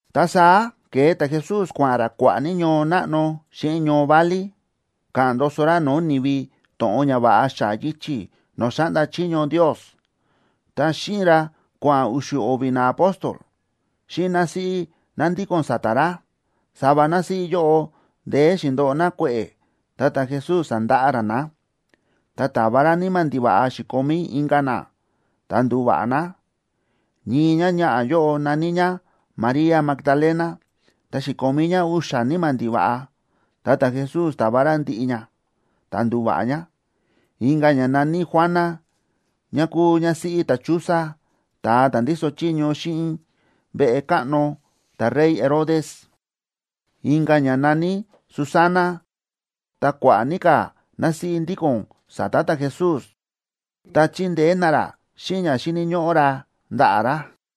Ta saá ke̱e ta̱Jesús, kua̱ꞌa̱n ra kua̱ꞌa̱ ní ñoo náꞌno xíꞌin ñoo válí, káꞌa̱n ndoso ra no̱o̱ ni̱vi to̱ꞌon ñava̱ꞌa xa̱ꞌa̱ yichi̱ no̱o̱ xáꞌnda chiño Ndios. Ta xíꞌin ra kua̱ꞌa̱n u̱xu̱ o̱vi̱ naapóstol, xíꞌin násíꞌí ná ndíko̱n sa̱ta̱ ra. Sava násíꞌí yóꞌo ndeé xi̱ndoꞌo ná kue̱ꞌe̱, ta ta̱Jesús sa̱ndaꞌa ra ná. Ta ta̱va ra níma̱ ndiva̱ꞌa xi̱komí inka̱ ná, ta ndu̱va̱ꞌa ná. Ñii ñáñaꞌa̱ yóꞌo na̱ní ñá María Magdalena, ta xi̱komí ñá u̱xa̱ níma̱ ndiva̱ꞌa, ta ta̱Jesús ta̱va ra ndiꞌi ña, ta ndu̱va̱ꞌa ñá. Inka̱ ñá na̱ní Juana, ñá kúu ñásíꞌí ta̱Chuza, ta̱a ta̱ ndíso chiño xíꞌin veꞌe káꞌno ta̱rey Herodes. Inka̱ ñá na̱ní Susana, ta kua̱ꞌa̱ ní ka̱ násíꞌí ndíko̱n sa̱ta̱ ta̱Jesús, ta chíndeé ná ra xíꞌin ña xíni̱ ñóꞌó ra ndaꞌa̱ ra.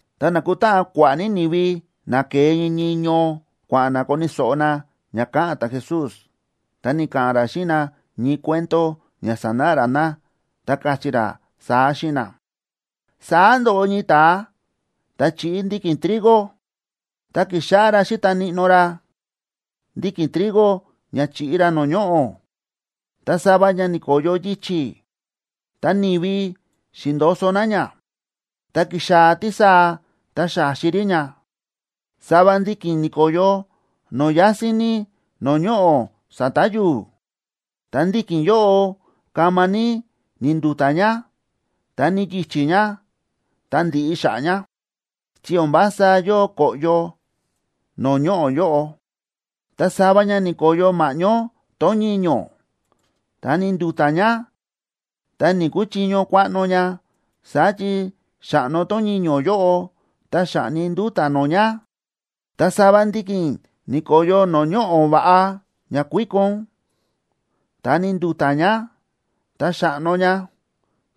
Ta na̱kutáꞌan kua̱ꞌa̱ ní ni̱vi na ke̱e ñii ñii ñoo, kua̱ꞌa̱n na koni̱ so̱ꞌo na ña ka̱ꞌa̱n ta̱Jesús, ta ni̱ka̱ꞌa̱n ra xíꞌin na ñii cuento ña sanáꞌa ra na, ta káchí ra saá xíꞌin na: ―Saá ndo̱ꞌo ñii ta̱a ta̱ chíꞌi ndiki̱n trigo. Ta ki̱xáꞌá ra xíta níꞌnó ra ndiki̱n trigo ña chiꞌi ra no̱o̱ ñoꞌo̱. Ta sava ña ni̱ko̱yo yichi̱, ta ni̱vi xi̱ndo̱so̱ na ña, ta ki̱xaa̱ tísaa ta xa̱xi rí ña. Sava ndiki̱n ni̱ko̱yo no̱o̱ yásín ní no̱o̱ ñoꞌo̱ sa̱ta̱ yu̱u̱, ta ndiki̱n yóꞌo kama ní ni̱ndu̱ta̱ ña, ta ni̱yichí ña, ta ndi̱ꞌi xa̱ꞌa̱ ña, chi o̱n vása yóo ko̱ꞌyo no̱o̱ ñoꞌo̱ yóꞌo. Ta sava ña ni̱ko̱yo ma̱ꞌñó tón ñiño̱, ta ni̱ndu̱ta̱ ña, ta ni̱‑kuchiño kuaꞌno ña, saá chi xa̱ꞌno tón ñiño̱ yóꞌo, ta xa̱ꞌni nduta̱ nó ña. Ta sava ndiki̱n ni̱ko̱yo no̱o̱ ñoꞌo̱ va̱ꞌa ña kuíkon. Ta ni̱ndu̱ta̱ ña, ta xa̱ꞌno ña,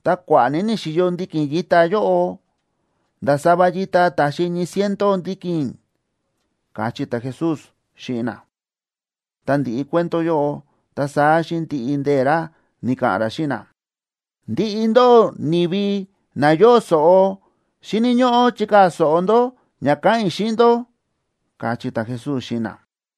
ta kua̱ꞌa̱ ní ni̱xi̱yo ndiki̱n yita yóꞌo, nda̱ sava yita ta̱xi ñii ciento ndiki̱n ―káchí ta̱Jesús xíꞌin na. Tá ndi̱ꞌi cuento yóꞌo, ta saá xíꞌin ndiꞌi ndee̱ ra ni̱ka̱ꞌa̱n ra xíꞌin na: ―Ndiꞌi ndóꞌó ni̱vi na yóo so̱ꞌo, xíni̱ ñóꞌó chikaa̱ so̱ꞌo ndó ña káꞌa̱n i̱ xíꞌin ndó ―káchí ta̱Jesús xíꞌin na.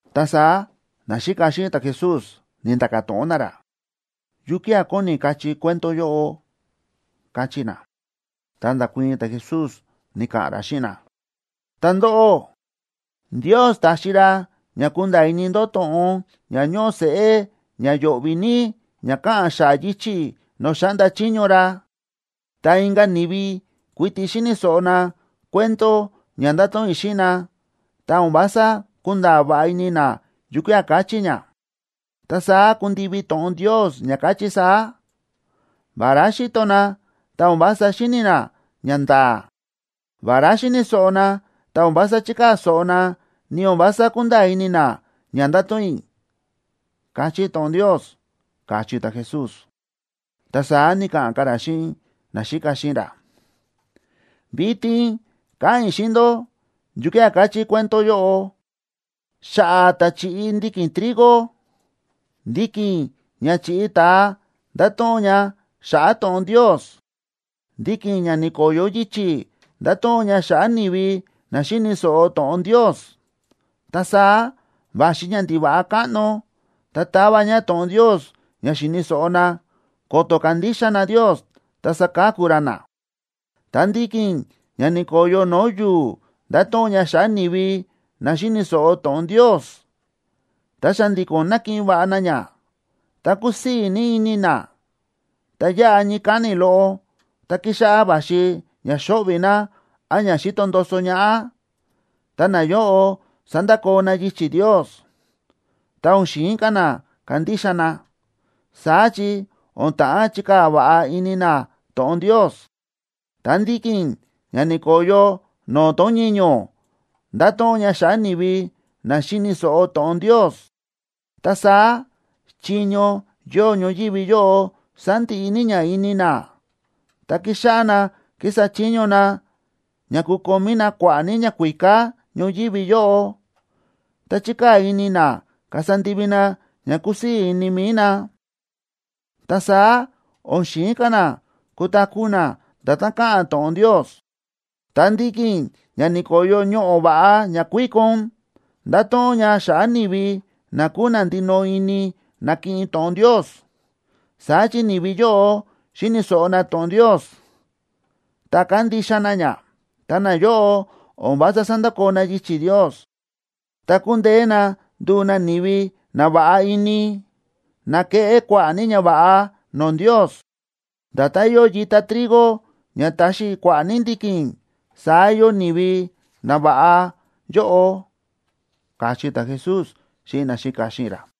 Ta saá naxíka xíꞌin ta̱Jesús ni̱nda̱ka̱ to̱ꞌon na ra: ―¿Yukía̱ kóni kachí cuento yóꞌo? ―káchí na. Ta nda̱kuii̱n ta̱Jesús, ni̱ka̱ꞌa̱n ra xíꞌin na: ―Ta ndóꞌó, Ndios ta̱xi ra ña kúnda̱a̱ ini ndó to̱ꞌon ña ñóꞌo seꞌé ña yo̱ꞌvi̱ ní ña káꞌa̱n xa̱ꞌa̱ yichi̱ no̱o̱ xáꞌnda chiño ra. Ta inka̱ ni̱vi kuiti xíni̱ so̱ꞌo na cuento ña ndáto̱ꞌon i̱ xíꞌin na, ta o̱n vása kúnda̱a̱ va̱ꞌa ini na yukía̱ káchí ña. Ta saá ku̱ndivi to̱ꞌon Ndios ña káchí saá: “Vará xíto na, ta o̱n vása xíni̱ na ñanda̱a̱. Vará xíni̱ so̱ꞌo na, ta o̱n vása chíkaa̱ so̱ꞌo na, ni o̱n vása kúnda̱a̱ ini na ña ndáto̱ꞌon i̱”, káchí to̱ꞌon Ndios ―káchí ta̱Jesús. Ta saá ni̱ka̱ꞌa̱n ka̱ ra xíꞌin naxíka xíꞌin ra: ―Vitin káꞌa̱n i̱ xíꞌin ndó yukía̱ káchí cuento yóꞌo xa̱ꞌa̱ ta̱ chíꞌi ndiki̱n trigo. Ndiki̱n ña chi̱ꞌi ta̱a ndáto̱ꞌon ña xa̱ꞌa̱ to̱ꞌon Ndios. Ndiki̱n ña ni̱ko̱yo yichi̱ ndáto̱ꞌon ña xa̱ꞌa̱ ni̱vi na xíni̱ so̱ꞌo to̱ꞌon Ndios, ta saá va̱xi ñandiva̱ꞌa káꞌno, ta táva ña to̱ꞌon Ndios ña xi̱ni̱ so̱ꞌo na, ko̱to̱ kandixa na Ndios ta saka̱ku ra na. Ta ndiki̱n ña ni̱ko̱yo no̱o̱ yu̱u̱ ndáto̱ꞌon ña xa̱ꞌa̱ ni̱vi na xíni̱ so̱ꞌo to̱ꞌon Ndios, ta xa̱ndi̱ko̱n nákiꞌin va̱ꞌa na ña, ta kúsii̱ ní ini na. Ta yáꞌa ñii káni̱ loꞌo, tá kíxáꞌá va̱xi ña xóꞌvi̱ na án ña xíto ndoso ñaꞌá, ta nayóꞌo sándakoo na yichi̱ Ndios, ta o̱n xi̱in ka̱ na kandixa na, saá chi o̱n ta̱ꞌán chikaa̱ va̱ꞌa ini na to̱ꞌon Ndios. Ta ndiki̱n ña ni̱ko̱yo no̱o̱ tón ñiño̱ ndáto̱ꞌon ña xa̱ꞌa̱ ni̱vi na xíni̱ so̱ꞌo to̱ꞌon Ndios. Ta saá chiño yóo ñoyívi yóꞌo sándiꞌi ní ña ini na, ta kíxáꞌá na kísa chiño na ña kukomí na kua̱ꞌa̱ ní ñakuíká ñoyívi yóꞌo, ta chíkaa̱ ní ini na kasa ndivi na ña kúsii̱ ini mi̱i na, ta saá o̱n xi̱in ka̱ na kutaku̱ na nda̱tán káꞌa̱n to̱ꞌon Ndios. Ta ndiki̱n ña ni̱ko̱yo ñoꞌo̱ va̱ꞌa ña kuíkon ndáto̱ꞌon ña xa̱ꞌa̱ ni̱vi na kúu na ndinoꞌo ini nákiꞌin to̱ꞌon Ndios. Saá chi ni̱vi yóꞌo xíni̱ so̱ꞌo na to̱ꞌon Ndios, ta kándixa na ña. Ta nayóꞌo o̱n vása sándakoo na yichi̱ Ndios, ta kúndeé na nduu na ni̱vi na va̱ꞌa ini, na keꞌé kua̱ꞌa̱ ní ñava̱ꞌa no̱o̱ Ndios. Nda̱tán yóo yita trigo ña ta̱xi kua̱ꞌa̱ ní ndiki̱n, saá yóo ni̱vi nava̱ꞌa yóꞌo ―káchí ta̱Jesús xíꞌin naxíka xíꞌin ra.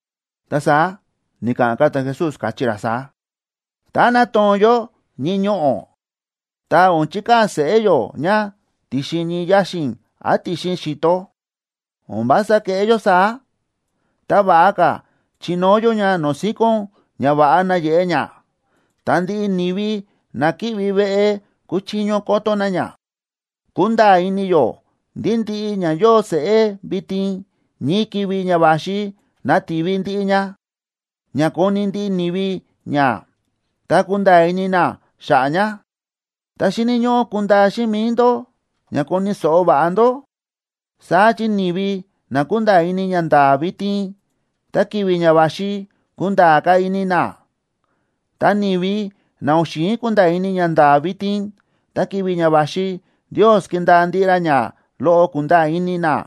Ta saá ni̱ka̱ꞌa̱n ka̱ ta̱Jesús, káchí ra saá: ―Tá nátoo̱n yó ñii ñoꞌo̱, ta o̱n chikaa̱ seꞌé yó ña ti̱xin ñii yaxi̱n án ti̱xin xi̱to. O̱n vása kéꞌé yó saá, ta va̱ꞌa ka̱ chinóo yó ña no̱o̱ síkón ña va̱ꞌa nayeꞌe ña, ta ndiꞌi ni̱vi na ki̱ꞌvi veꞌe kuchiño koto na ña. Kúnda̱a̱ ini yó ndí ndiꞌi ña yóo seꞌé vitin, ñii ki̱vi̱ ña va̱xi nativi ndiꞌi ña, ña koni̱ ndiꞌi ni̱vi ña, ta kunda̱a̱ ini na xa̱ꞌa̱ ña. ’Ta xíni̱ ñóꞌó kundaa xíꞌin mi̱i ndó ña koni̱ so̱ꞌo va̱ꞌa ndó. Saá chi ni̱vi na kúnda̱a̱ ini ñanda̱a̱ vitin, ta ki̱vi̱ ña va̱xi kunda̱a̱ ka̱ ini na. Ta ni̱vi na o̱n xi̱in kunda̱a̱ ini ñanda̱a̱ vitin, ta ki̱vi̱ ña va̱xi Ndios kindaa ndiꞌi ra ña loꞌo kúnda̱a̱ ini na.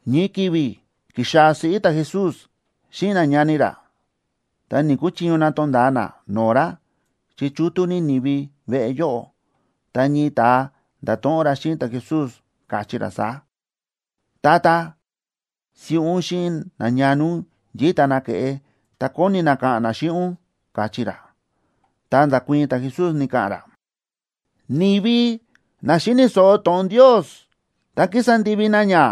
Ñii ki̱vi̱ ki̱xaa̱ siꞌí ta̱Jesús xíꞌin nañani ra, ta ni̱‑kuchiño na tonda̱a na no̱o̱ ra, chi chútú ní ni̱vi veꞌe yóꞌo. Ta ñii ta̱a nda̱to̱ꞌon ra xíꞌin ta̱Jesús, káchí ra saá: ―Tata, siꞌí ún xíꞌin nañani ún yíta na ke̱ꞌe, ta kóni na ka̱ꞌa̱n na xíꞌin ún ―káchí ra. Ta nda̱kuii̱n ta̱Jesús, ni̱ka̱ꞌa̱n ra: ―Ni̱vi na xíni̱ so̱ꞌo to̱ꞌon Ndios ta kísa ndivi na ña,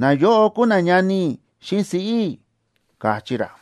nayóꞌo kúu nañani i̱ xíꞌin siꞌí i̱ ―káchí ra.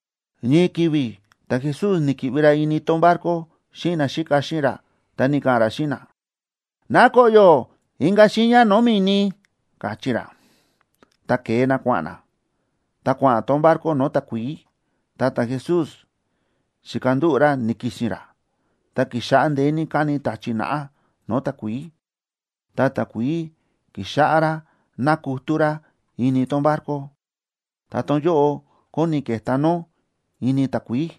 Ñii ki̱vi̱ ta̱Jesús ni̱ki̱ꞌvi ra ini tón barco xíꞌin naxíka xíꞌin ra, ta ni̱ka̱ꞌa̱n ra xíꞌin na: ―Ná koꞌyo̱ inka̱ xiiña no̱o̱ mi̱ni ―káchí ra. Ta ke̱e na kua̱ꞌa̱n na. Ta kua̱ꞌa̱n tón barco no̱o̱ takuií, ta ta̱Jesús xi̱kandúꞌu̱ ra ni̱ki̱si̱n ra. Ta ki̱xáꞌá ndeé ní káni ta̱chi̱ naꞌá no̱o̱ takuií, ta takuií ki̱xáꞌá rá nákutú rá ini tón barco, ta tón yóꞌo kóni ke̱tá nó ini takuií.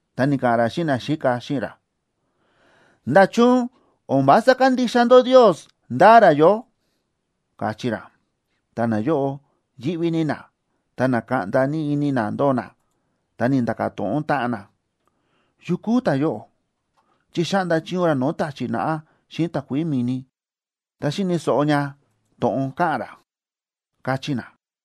Ta ni̱ka̱ꞌa̱n ra xíꞌin naxíka xíꞌin ra: ―¿Nda̱chun o̱n vása kándixa ndó Ndios ndáa ra yó? ―káchí ra. Ta nayóꞌo yíꞌví ní na, ta na̱kaꞌnda ní ini na ndóo na, ta ni̱nda̱ka̱ to̱ꞌon táꞌan na: ―¿Yu kúu ta̱yóꞌo? Chi xáꞌnda chiño ra no̱o̱ ta̱chi̱ naꞌá xíꞌin takuií mi̱ni, ta xíni̱ so̱ꞌo ña to̱ꞌon káꞌa̱n ra ―káchí na.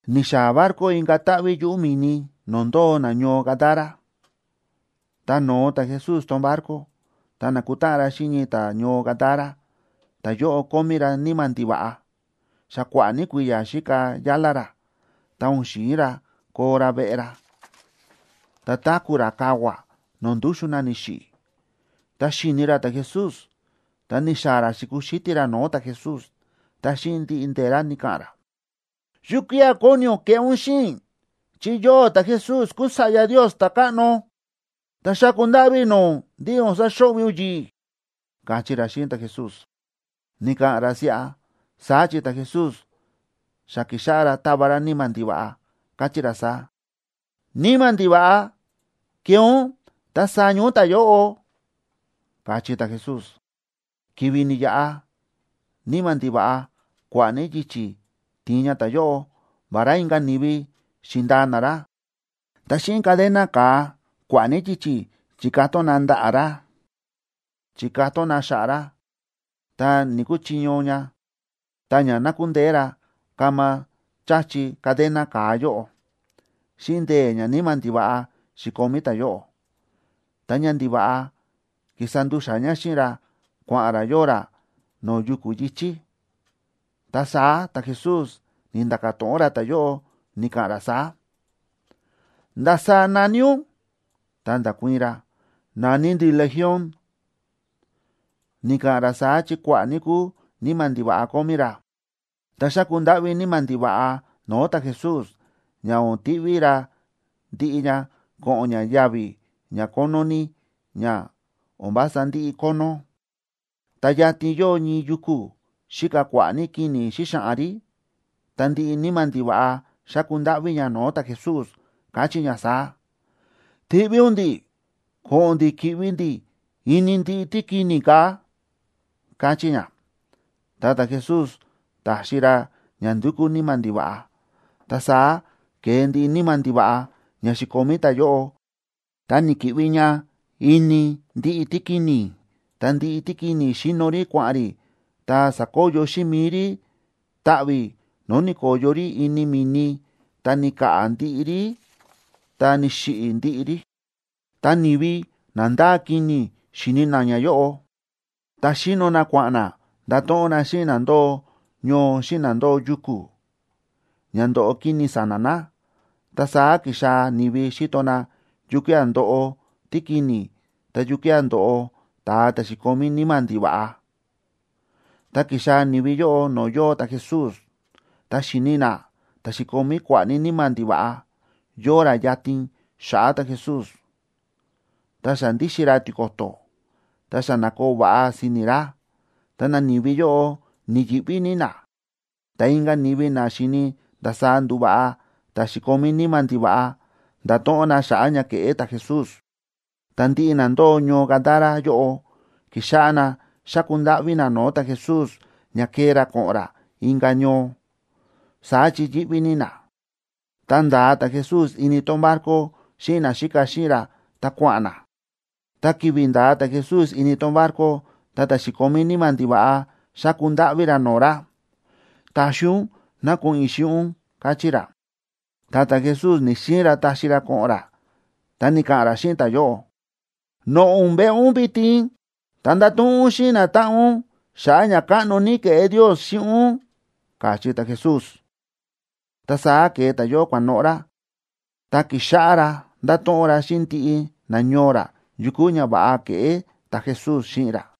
Ni̱xaa̱ barco inka̱ táꞌví yuꞌu̱ mi̱ni no̱o̱ ndóo nañoo Gadara. Tá no̱o ta̱Jesús tón barco, ta na̱kutáꞌan ra xíꞌin ñii ta̱ñoo Gadara, ta ta̱yóꞌo kómí ra níma̱ ndiva̱ꞌa. Xa kua̱ꞌa̱ ní kui̱ya̱ xíka yálá ra, ta o̱n xi̱in ra koo ra veꞌe ra, ta táku̱ ra kavua̱ no̱o̱ ndúxu̱n na ni̱xiꞌi̱. Tá xi̱ni ra ta̱Jesús, ta ni̱xaa̱ ra xi̱kuxítí ra no̱o̱ ta̱Jesús, ta xíꞌin ndiꞌi ndee̱ ra ni̱ka̱ꞌa̱n ra: ―¿Yukía̱ kóni ún keꞌé ún xíꞌin i̱? Chi yóꞌó ta̱Jesús kúu Sa̱ꞌya Ndios ta̱káꞌno. Ta xáku ndáꞌví i̱ no̱o̱ ún ndí o̱n saxo̱ꞌvi̱ ún yi̱ꞌi̱ ―káchí ra xíꞌin ta̱Jesús. Ni̱ka̱ꞌa̱n ra siꞌa, saá chi ta̱Jesús xa ki̱xáꞌá ra táva ra níma̱ ndiva̱ꞌa, káchí ra saá: ―¡Níma̱ ndiva̱ꞌa, kee ún ta saña ún ta̱yóꞌo! ―káchí ta̱Jesús. Ki̱vi̱ ni̱yaꞌa, níma̱ ndiva̱ꞌa kua̱ꞌa̱ ní yichi̱ ti̱in ña ta̱yóꞌo. Vará inka̱ ni̱vi xi̱ndaa na ra, ta xíꞌin cadena ka̱a kua̱ꞌa̱ ní yichi̱ chi̱katón na ndaꞌa̱ ra, chi̱katón na xa̱ꞌa̱ ra, ta ni̱‑kuchiño ña, ta ña na̱kundeé ra kama cha̱chi cadena ka̱a yóꞌo, xíꞌin ndee̱ ñaníma̱ ndiva̱ꞌa xi̱komí ta̱yóꞌo. Ta ñandiva̱ꞌa ki̱sa ndu̱xa̱ ña xíꞌin ra kua̱ꞌa̱n ra yóo ra no̱o̱ yuku̱ yi̱chí. Ta saá ta̱Jesús ni̱nda̱ka̱ to̱ꞌon ra ta̱yóꞌo, ni̱ka̱ꞌa̱n ra saá: ―¿Ndasaá na̱ní ún? Ta nda̱kuii̱n ra: ―Na̱ní ndi̱ Legión. Ni̱ka̱ꞌa̱n ra saá chi kua̱ꞌa̱ ní kúu níma̱ ndiva̱ꞌa kómí ra. Ta xáku ndáꞌví níma̱ ndiva̱ꞌa no̱o̱ ta̱Jesús, ña o̱n tiꞌví ra ndiꞌi ña ko̱ꞌo̱n ña yavi̱ ña kónó ní ña o̱n vása ndiꞌi kónó. Ta yatin yóo ñii yuku̱, xíka kua̱ꞌa̱ ní kini̱ xíxaꞌan rí. Ta ndiꞌi níma̱ ndiva̱ꞌa xa̱ku ndáꞌví ña no̱o̱ ta̱Jesús, káchí ña saá: ―Tiꞌví ún ndi̱ꞌi̱ ko̱ꞌo̱n ndi̱ ki̱ꞌvi ndi̱ ini ndiꞌi tíkini̱ kaa̱ ―káchí ña. Ta ta̱Jesús ta̱xi ra ña ndu̱kú níma̱ ndiva̱ꞌa. Ta saá ke̱e ndiꞌi níma̱ ndiva̱ꞌa ña xi̱komí ta̱yóꞌo, ta ni̱ki̱ꞌvi ña ini ndiꞌi tíkini̱. Ta ndiꞌi tíkini̱ xi̱no rí kua̱ꞌa̱n rí, ta sa̱koyo xíꞌin mi̱i rí taꞌvi̱, no̱o̱ ni̱ko̱yo rí ini mi̱ni, ta ni̱ka̱ꞌa̱ ndiꞌi rí ta ni̱xiꞌi̱ ndiꞌi rí. Ta ni̱vi na ndáa kini̱ xi̱ni na ñayóꞌo, ta xíno na kua̱ꞌa̱n na ndato̱ꞌon na xíꞌin na ndóo ñoo xíꞌin na ndóo yuku̱, ña ndo̱ꞌo kini̱ sa̱na̱ na. Ta saá ki̱xaa̱ ni̱vi xíto na yukía̱ ndo̱ꞌo tíkini̱ ta yukía̱ ndo̱ꞌo ta̱a ta̱ xi̱komí níma̱ ndiva̱ꞌa. Ta ki̱xaa̱ ni̱vi yóꞌo no̱o̱ yóo ta̱Jesús, ta xi̱ni na ta̱ xi̱komí kua̱ꞌa̱ ní níma̱ ndiva̱ꞌa, yóo ra yatin xa̱ꞌa̱ ta̱Jesús, ta xa ndíxin ra tiko̱to̱, ta xa na̱koo va̱ꞌa si̱ni̱ ra. Ta nani̱vi yóꞌo ni̱yi̱ꞌví ní na. Ta inka̱ ni̱vi na xi̱ni ndasaá ndu̱va̱ꞌa ta̱ xi̱komí níma̱ ndiva̱ꞌa nda̱to̱ꞌon na xa̱ꞌa̱ ña ke̱ꞌé ta̱Jesús. Ta ndiꞌi na ndóo ñoo Gadara yóꞌo ki̱xáꞌá na xáku ndáꞌví na no̱o̱ ta̱Jesús ña kee ra ko̱ꞌo̱n ra inka̱ ñoo. Saá chi yíꞌví ní na. Ta nda̱a ta̱Jesús ini tón barco xíꞌin naxíka xíꞌin ra ta kua̱ꞌa̱n na. Ta ki̱vi̱ nda̱a ta̱Jesús ini tón barco, ta ta̱ xi̱komí níma̱ ndiva̱ꞌa xa̱ku ndáꞌví ra no̱o̱ ra: ―Taxi ún ná ko̱ꞌo̱n i̱ xíꞌin ún ―káchí ra. Ta ta̱Jesús ni̱‑xiin ra taxi ra ko̱ꞌo̱n ra, ta ni̱ka̱ꞌa̱n ra xíꞌin ta̱yóꞌo: ―Noꞌo̱ ún veꞌe ún vitin, ta ndato̱ꞌon ún xíꞌin natáꞌan ún xa̱ꞌa̱ ñakáꞌno ní ke̱ꞌé Ndios xíꞌin ún ―káchí ta̱Jesús. Ta saá ke̱e ta̱yóꞌo kua̱noꞌo̱ ra, ta ki̱xáꞌá ra ndáto̱ꞌon ra xíꞌin ndiꞌi nañoo ra yu kúu ñava̱ꞌa ke̱ꞌé ta̱Jesús xíꞌin ra.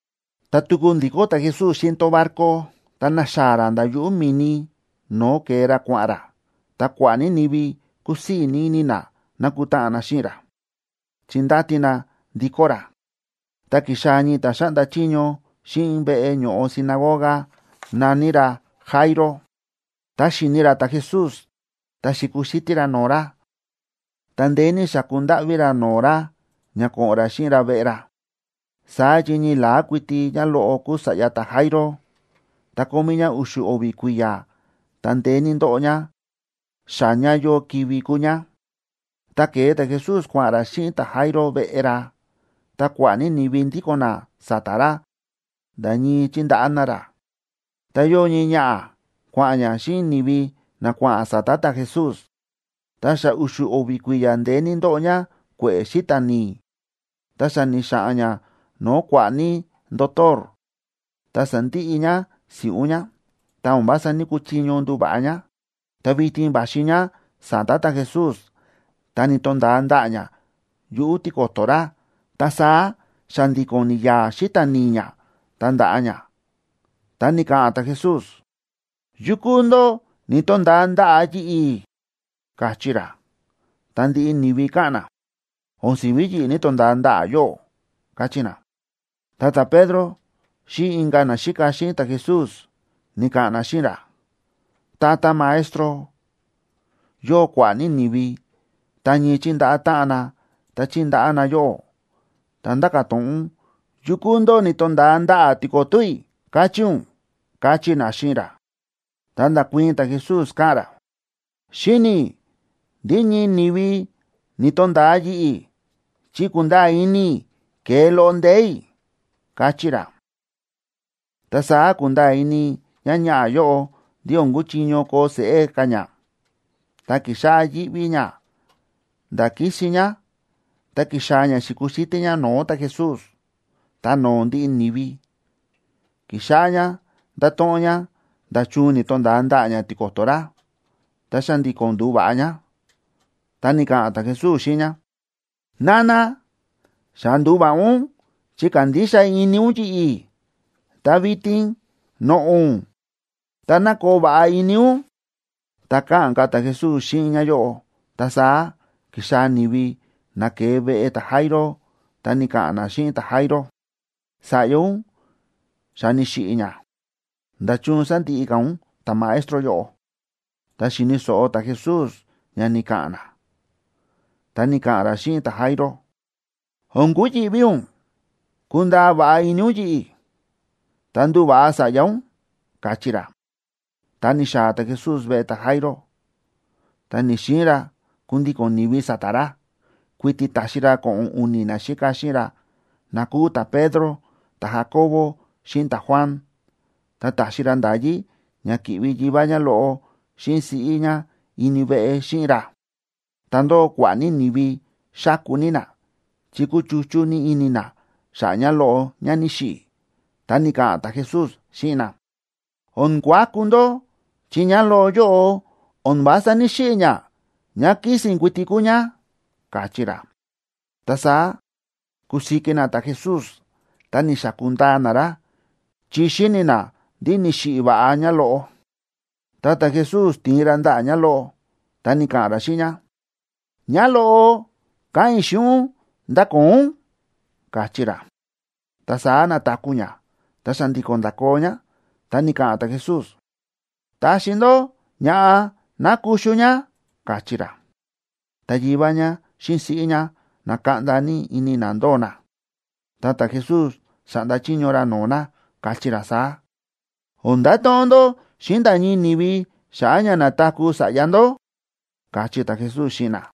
Tá tuku ndi̱kó ta̱Jesús xíꞌin tón barco, ta na̱xaa̱ ra nda̱ yuꞌu̱ mi̱ni no̱o̱ ke̱e ra kua̱ꞌa̱n ra, ta kua̱ꞌa̱ ní ni̱vi kúsii̱ ní ini na na̱kutáꞌan na xíꞌin ra, chi ndáti na ndikó ra. Ta ki̱xaa̱ ñii ta̱ xáꞌnda chiño xíꞌin veꞌe ño̱ꞌo sinagoga, na̱ní ra Jairo. Tá xi̱ni ra ta̱Jesús, ta xi̱kuxítí ra no̱o̱ ra, ta ndeé ní xa̱ku ndáꞌví ra no̱o̱ ra ña ko̱ꞌo̱n ra xíꞌin ra veꞌe ra. Saá chi ñii la̱á kuiti ñáloꞌo kúu sa̱ꞌya ta̱Jairo, ta kómí ñá u̱xu̱ o̱vi̱ kui̱ya̱, ta ndeé ní ndóꞌo ñá, xa ña yóo kivi̱ kúu ñá. Ta ke̱e ta̱Jesús kua̱ꞌa̱n ra xíꞌin ta̱Jairo veꞌe ra. Ta kua̱ꞌa̱ ní ni̱vi ndíko̱n na sa̱ta̱ ra nda̱ ñii chíndaꞌá na ra. Ta yóo ñii ñaꞌa̱ kua̱ꞌa̱n ñá xíꞌin ni̱vi na kua̱ꞌa̱n sa̱ta̱ ta̱Jesús, ta xa u̱xu̱ o̱vi̱ kui̱ya̱ ndeé ní ndóꞌo ñá kue̱ꞌe̱ xíta̱ ni̱i̱. Ta xa ni̱xa̱ꞌa̱n ñá no̱o̱ kua̱ꞌa̱ ní ndotor, ta sa̱ndiꞌi ñá si̱ꞌún ñá. Ta o̱n vása ní‑kuchiño nduva̱ꞌa ñá. Ta vitin va̱xi ñá sa̱ta̱ ta̱Jesús, ta ni̱to̱nda̱a ndaꞌa̱ ñá yuꞌu̱ tiko̱to̱ ra, ta saá xa̱ndi̱ko̱n ni̱ya̱a̱ xíta̱ ni̱i̱ ñá, ta nda̱ꞌa ñá. Ta ni̱ka̱ꞌa̱n ta̱Jesús: ―¿Yukú ndó ni̱to̱nda̱a ndaꞌa̱ yi̱ꞌi̱? ―káchí ra. Ta ndiꞌi ni̱vi káꞌa̱n na: ―O̱n si̱ví yi̱ꞌi̱ ni̱to̱nda̱a ndaꞌa̱ yóꞌó ―káchí na. Ta ta̱Pedro xíꞌin inka̱ naxíka xíꞌin ta̱Jesús ni̱ka̱ꞌa̱n na xíꞌin ra: ―Tata Maestro, yóo kua̱ꞌa̱ ní ni̱vi ta ñii chíndaꞌá táꞌan na, ta chíndaꞌá na yóꞌó, ta ndáka̱ to̱ꞌon ún: ¿Yukú ndó ni̱to̱nda̱a ndaꞌa̱ tiko̱to̱ i̱?, káchí ún ―káchí na xíꞌin ra. Ta nda̱kuii̱n ta̱Jesús, káꞌa̱n ra: ―Xíni̱ i̱ ndí ñii ni̱vi ni̱to̱nda̱a yi̱ꞌi̱, chi kúnda̱a̱ ini i̱ ke̱e loꞌo ndee̱ i̱ ―káchí ra. Ta saá ku̱nda̱a̱ ini ñáñaꞌa̱ yóꞌo ndí o̱n kúchiño koo seꞌé ka̱ ñá, ta ki̱xáꞌá yíꞌví ñá nda̱ kísin ñá, ta ki̱xaa̱ ñá xi̱kuxítí ñá no̱o̱ ta̱Jesús. Ta no̱o̱ ndiꞌi ni̱vi, ki̱xáꞌá ñá nda̱to̱ꞌon ñá nda̱chun ni̱to̱nda̱a ndaꞌa̱ ñá tiko̱to̱ ra, ta xa̱ndi̱ko̱n ndu̱va̱ꞌa ñá. Ta ni̱ka̱ꞌa̱n ta̱Jesús xíꞌin ñá: ―Nana, xa ndu̱va̱ꞌa ún chi kándixa ini ún yi̱ꞌi̱. Ta vitin noꞌo̱ ún, ta ná koo va̱ꞌa ini ún. Tá káꞌa̱n ka̱ ta̱Jesús xíꞌin ñáyóꞌo, ta saá ki̱xaa̱ ni̱vi na ke̱e veꞌe ta̱Jairo, ta ni̱ka̱ꞌa̱n na xíꞌin ta̱Jairo: ―Sa̱ꞌya ún xa ni̱xiꞌi̱ ñá. ¿Nda̱chun sándiꞌi ka̱ ún ta̱Maestro yóꞌo? Ta xi̱ni̱ so̱ꞌo ta̱Jesús ña ni̱ka̱ꞌa̱n na, ta ni̱ka̱ꞌa̱n ra xíꞌin ta̱Jairo: ―O̱n kuyi̱ꞌví ún. Kundaa va̱ꞌa ini ún yi̱ꞌi̱, ta nduva̱ꞌa sa̱ꞌya ún ―káchí ra. Ta ni̱xaa̱ ta̱Jesús veꞌe ta̱Jairo, ta ni̱‑xiin ra kundíko̱n ni̱vi sa̱ta̱ ra, kuiti ta̱xi ra ko̱ꞌo̱n u̱ni̱ naxíka xíꞌin ra na kúu ta̱Pedro, ta̱Jacobo, xíꞌin ta̱Juan. Ta ta̱xi ra nda̱yí ña ki̱ꞌvi yivá ñáloꞌo xíꞌin siꞌí ñá ini veꞌe xíꞌin ra. Ta ndóo kua̱ꞌa̱ ní ni̱vi xáku ní na chi kúchuchú ní ini na xa̱ꞌa̱ ñáloꞌo ñá ni̱xiꞌi̱. Ta ni̱ka̱ꞌa̱n ta̱Jesús xíꞌin na: ―O̱n kuaku ndó, chi ñáloꞌo yóꞌo o̱n vása ní‑xiꞌi̱ ñá, ñá kísi̱n kuiti kúu ñá ―káchí ra. Ta saá ku̱siki na ta̱Jesús ta ni̱xaku̱ ndaa na ra, chi xi̱ni̱ na ndí ni̱xiꞌi̱ va̱ꞌa ñá. Ta ta̱Jesús ti̱in ra ndaꞌa̱ ñáloꞌo, ta ni̱ka̱ꞌa̱n ra xíꞌin ñá: ―Ñáloꞌo, káꞌa̱n i̱ xíꞌin ún, ¡ndakoo ún! ―káchí ra. Ta saá na̱taku̱ ñá, ta xa̱ndi̱ko̱n nda̱koo ñá. Ta ni̱ka̱ꞌa̱n ta̱Jesús: ―Taxi ndó ña̱ꞌa ná kuxu ñá ―káchí ra. Ta yivá ñá xíꞌin siꞌí ñá na̱kaꞌnda ini na ndóo na, ta ta̱Jesús xa̱ꞌnda chiño ra no̱o̱ na, káchí ra saá: ―O̱n ndato̱ꞌon ndó xíꞌin nda̱ ñii ni̱vi xa̱ꞌa̱ ña na̱taku̱ sa̱ꞌya ndó ―káchí ta̱Jesús xíꞌin na.